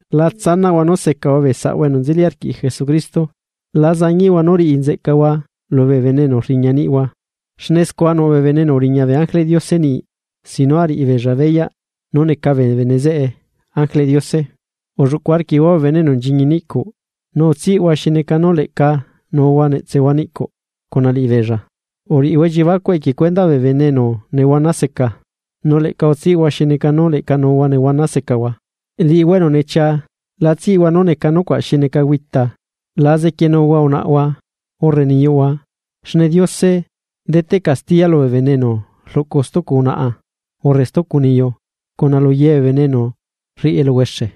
La tsanaꞌhua nú secahua bee saꞌhua enu nzeli arquiꞌ Jesucristo. La zañiꞌhua nú riꞌi nzeꞌcahua lubee bene enu rriña niꞌhua, xne scua nuꞌ bee bene enu uriña bee ángeleꞌ Diose niꞌi sin nú ariꞌi beella beyaꞌ nú neca bee bene zeꞌe ángeleꞌ Diose. Ulluꞌcu arquiꞌhua bee bene enu nchiñi niꞌcuꞌ, nu utsiꞌhua xi neca nú leꞌca nuuhua netsehua niꞌcuꞌ cuna liꞌibeella. Uriꞌihua elliebacuꞌ equie cuendaꞌ bee bene enu nehuana seca, nu leꞌca utsiꞌhua xi neca nú leꞌca nuuhua nehuana secahua. Liꞌihua enu nechia la tsiꞌhua nú neca nucuaꞌ xi neca güita, la zequienuhua unaꞌhua urre niyuꞌhua xne Diose deteꞌ castiya lubee bene enu rluꞌcu stucu unaꞌa urre stucu niyu cuna luyee bee bene enu rriꞌi eluhuexe.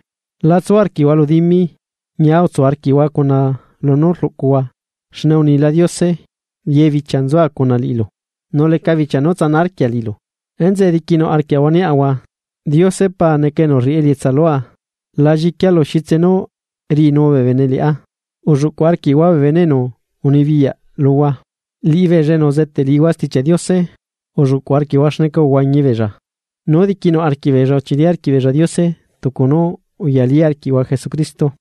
Latsu arquiꞌhua lu dimi, ñia utsu arquiꞌhua cuna lunú rluꞌcuhua xne unila Diose: “Ye bichia nzua cuna liꞌilu, nu leca bichia nu tsana arquia liꞌilu.” Enzeꞌe diquinuꞌ arquiaꞌahua niaꞌahua: Diose Pa neca enu rriꞌi elietsa lua, la lliquia lu xitse nú riꞌinu bee bene liꞌá. Ulluꞌcu arquiꞌhua bee bene enu unibiyaꞌ luhua, liꞌibeella enu uzeteꞌ liꞌihua Stichiaꞌ Diose. Ulluꞌcuꞌ arquiꞌhua xneca uhuañi beella, nú diquinuꞌ arquiꞌbeella uchili arquiꞌ beella Diose tucu nú uyali arquiꞌhua Jesucristo.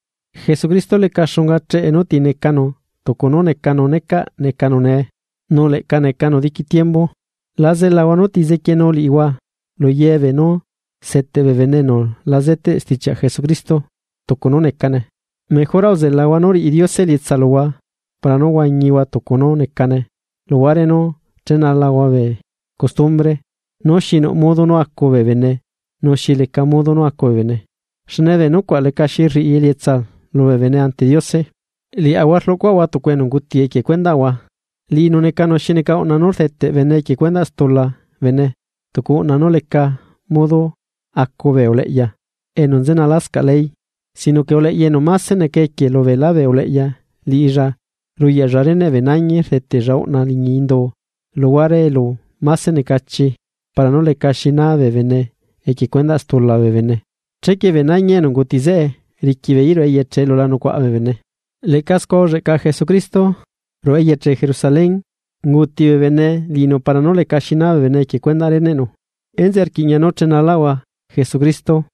Jesucristo leca xunga cheꞌe nú ti necanu tucu nú necanu necaꞌ necanu nee nu leꞌca necanu diqui tiembu. La zelahua núti zequienu liꞌihua luye beenú seteꞌ bee bene enu la zeteꞌ stichiaꞌ Jesucristo tucu nú necane. Mejora uzelahua nú riꞌi Diose elietsa luhua para nú huañihua tucu nú necane luhuare nú chenalahua bee costumbre nú xi nuꞌ modo nú acu bee bene nu xi leca modo nú acu bee bene, xne bee nucuaꞌ lecaxi rriꞌi elietsa lubee bene ante Diose. Liaꞌahua rluꞌcuaꞌahua tucu enu unguti equie cuendaꞌahua, liꞌinu necanu xi neca uꞌna nú rdeteꞌ bene equie cuendaꞌ stula bene tucu uꞌna nú leca modo acu bee uleꞌya enu nzenalascaꞌ ley. Sino que uleꞌya enu máse neca equie lubeelá bee uleꞌya liꞌilla ruyaꞌlla reneꞌ bee nañi rdetella uꞌna liñi indu luhuare elu máse necachi para nú lecaxi naa bee bene equie cuendaꞌ stula bee bene. Chequie bee nañi enu unguti zeꞌe riqui beeí ruꞌu eyeche elu la nucuaꞌa bee bene. Leꞌca scua ulleꞌca Jesucristo, ruꞌu eyeche Jerusalén, unguuti bee bene liꞌinu para nú lecaxi naa bee bene equie cuendaꞌ reneꞌnu. Enzeꞌe rquiꞌña nú chenalaꞌahua Jesucristo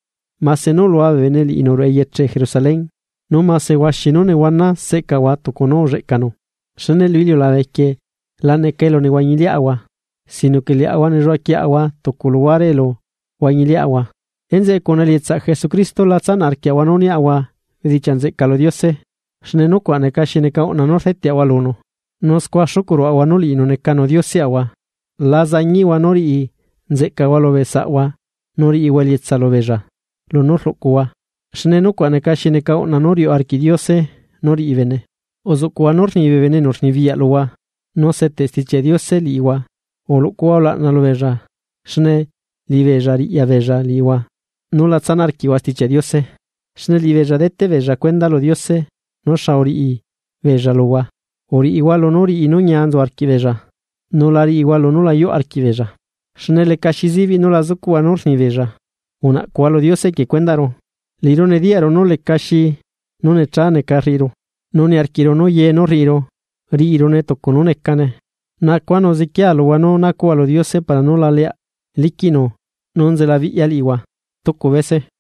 mase nú ulua bee bene liꞌinu ruꞌu eyeche Jerusalén, nu mase huaxi nú nehuana seꞌcaꞌahua tucu nú ulleꞌcanu. Xne lu iliulabe quieꞌ la necane elu nehuañiliaꞌahua, sino que liaꞌahua nelluaꞌa quieꞌahua tucu luhuare elu huañiliaꞌahua. Enzeꞌe cuna elietsaꞌ Jesucristo la tsanaꞌ arquiaꞌahua nú niaꞌahua bedichiaꞌ nzeꞌca lu Diose xne nuacuaꞌ neca xi neca uꞌna nú rdeteꞌahua lunu, nu scua xucuꞌ ruaꞌahua nú liꞌinu necanu Dioseꞌahua. La zañiꞌhua nú riꞌi nzeꞌcahua lubee saꞌhua nu riꞌihua elietsa lubeella lunú rluꞌcuhua, xne nucuaꞌ neca xi neca uꞌna nú riuꞌ arquiꞌ Diose nú riꞌi bene. Uzuꞌcuꞌhua nú rni bee bene enu rnibiyaꞌ luhua, nu seteꞌ Stichiaꞌ Diose liꞌihua uluꞌcuhua ulaꞌna lubeella xne liꞌibeella riꞌya beella liꞌihua nú la tsanaꞌ arquiꞌhua Stichiaꞌ Diose, xne liꞌibeella deteꞌbeella cuenda lu Diose nú xa uriꞌi beella luhua. Uriꞌihua lunú riꞌi nú ñia nzu arquiꞌbeella, nu la riꞌihua lunú la yuꞌ arquiꞌ beella, xne lecaxi zibiꞌ nú la zucuꞌhua nú rnibeella. Unaꞌcuhua lu Diose equie cuendaꞌru. Liꞌiru nediyaꞌru nú lecaxi nú necha neca rriꞌiru, nu niarquiꞌru nú ye nú rriꞌiru, riꞌirune tucu nú necane. Nacua nu zequiea luhua nú nacuꞌhua lu Diose para nú la leaꞌ liquiꞌnu nú nzelabiꞌya liꞌihua stucu bese.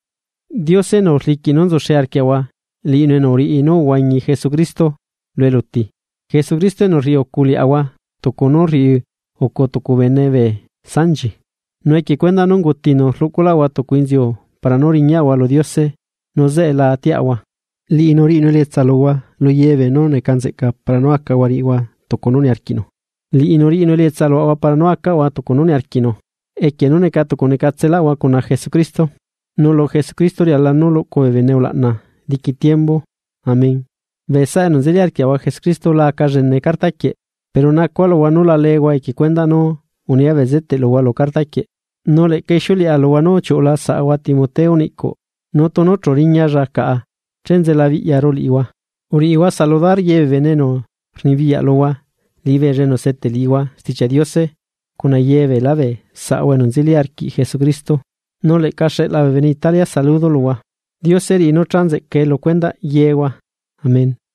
Diose enu rliquiꞌ nú nzuxe arquiaꞌahua liꞌinu enu uriꞌi nú uhuañi Jesucristo lu eluti, Jesucristo enu rriꞌi ucu liaꞌahua tucu nú rriucu tucu bene bee sanchi nu equie cuendaꞌ nú ungutinu rluꞌculaꞌahua tucu inziu para nú riñaꞌahua lu Diose nu zeꞌe la atiaꞌahua. Liꞌinu riꞌinu elietsa luhua lu yebeenú neca nzeꞌca para nú acahua riꞌihua tucu nú niarquiꞌnu. Liꞌinu riꞌinu elietsa luaꞌahua para nú acaꞌahua tucu nú niarquiꞌnu equie nú neca tucu necatselaꞌahua cuna Jesucristo, nu ¡Lu Jesucristo riala nú luꞌcu bee bene ulaꞌna diqui tiembu! Amén. Bee saꞌa enu nzeli arquiaꞌahua Jesucristo la aca llene carta quieꞌ, pero nacua luhua nú la leehua equie cuendaꞌ nú unia bezeteꞌ luhua lu carta quieꞌ. Nu leꞌca ixiuleꞌa luhua nú uchiuꞌula saꞌahua Timoteo niꞌcuꞌ, nu tunu chu riñalla caꞌa che nzelabiꞌyaru liꞌihua. Uriꞌihua saludar ye bee bene enu rnibiyaꞌ luhua liꞌibeella enu seteꞌ liꞌihua Stichiaꞌ Diose cuna ye beelá bee saꞌahua enu nzeli arquiaꞌahua Jesucristo. Nu leꞌca xeꞌla bee bene Italia saludo luhua. Diose riꞌi nú chanzeꞌcae lu cuendaꞌ yehua. Amén.